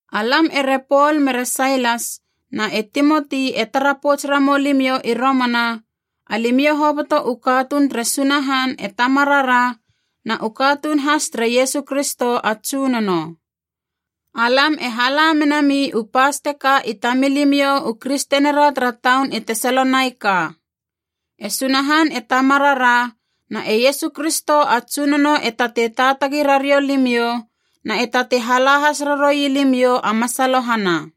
Alam ere Pol mere Sailas na e Timoti e tara pouts ramou limiou i romana, alimiou hoboto u katuun tere Sunahan e Tamarara na u katuun has tere Iesu Kristo a Tsunono. Alam e hala menami u pas teka i tamilimiou u kristenira tara taun i Tesalonaika. E Sunahan e Tamarara na e Iesu Kristo a Tsunono e tatei taatagi rariou limiou na e tatei hala has raroui limiou a masalohana.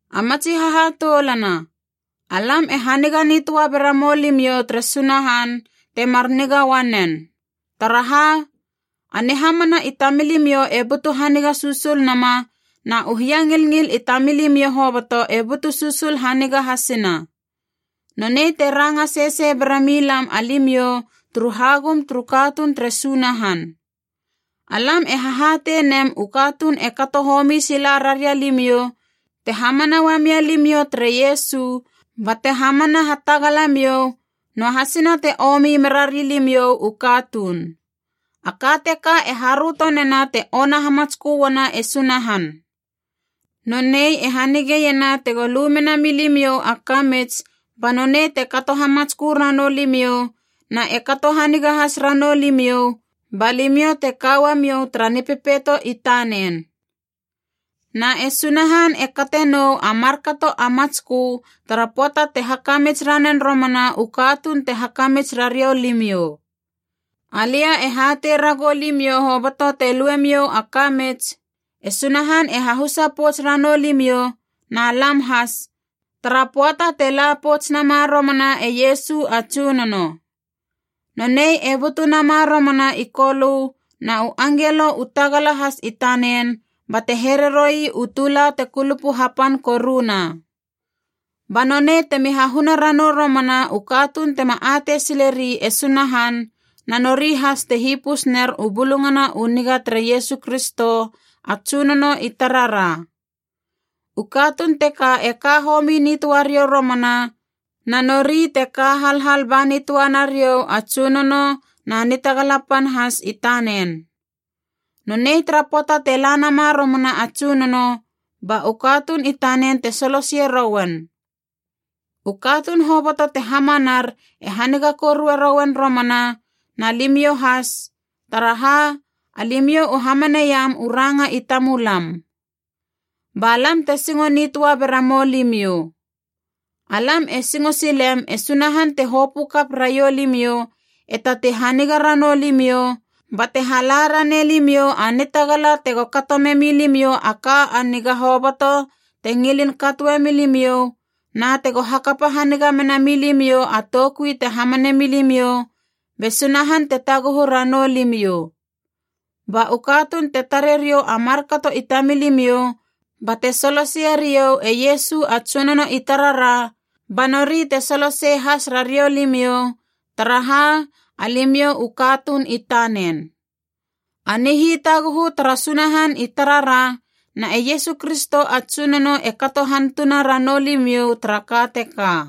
A matsi hahatoulana, alam e haniga nitöa bera mou limiou tere Sunahan, temar niga uanen. Taraha, a nihamana i tamilimiou e butu haniga susul nama na u hiangilngil i tamilimiou hoboto e butu susul haniga hasina. Nonei te ranga sesei bera milam alimiou turu hagum turu katuun tere Sunahan. Alam e hahatei nem u katuun e kato homi sila raria limiou te hamana uamia limiou tere Iesu bate hamana hatagalamiou, noahasina te omi merari limiou u katuun. A ka teka e haröto nena te ona hamatskö uana e Sunahan. Nonei e hanigeiena tego lu mena milimiou a kamits ba nonei te kato hamatskö ranou limiou na e kato haniga has ranou limiou ba limiou te ka uamiou tara Nipepeito i tanen. Na e Sunahan e kate nou a markato a matskö tara pöata te hakamits ranen romana u katuun te hakamits rariou limiou. Alia e hatei ragou limiou hoboto te luemiou a kamits, e Sunahan e hahusa pouts ranou limiou na lam has, tara pöata te la pouts nama romana e Iesu a Tsunono. Nonei e butu nama romana i Kolö na u angelo u tagala has i tanen bate here roi u tula te kulupu hapan koruna. Ba nonei temi hahuna ranou romana u katuun tema atei sileri e Sunahan na nori has te hipus ner u Bulungana u Niga tere Iesu Kristo a Tsunono i tarara. U katuun teka e ka homi nitöa riou romana, na nori te ka halhal ba nitöa nariou a Tsunono na nitagala pan has i tanen. Nonei tara pöata te la nama romana a Tsunono, ba u katuun i tanen te soloseie rouen. U katuun hoboto te hamanar e haniga korue rouen romana, na limiou has, taraha alimiou u hamaneiam u ranga i tamulam. Ba lam te singo nitöa bera moulimiou. Alam e singo silem e Sunahan te hopö kap raiou limiou e tatei haniga ranou limiou, bate hala ranei limiou a nitagala tego kato memi limiou a ka a niga hoboto te ngilin katoe milimiou, na tego hakapa haniga mena milimiou a toukui te hamane milimiou be Sunahan te taguhu ranou limiou. Ba u katuun te tare riou a markato i tamilimiou bate soloseie riou e Iesu a Tsunono i tarara, ba nori te solosei has rariou limiou, taraha alimiou u katuun i tanen. A nihitaguhu tara Sunahan i tarara na e Iesu Kristo a Tsunono e kato hantuna ranou limiou tara ka teka.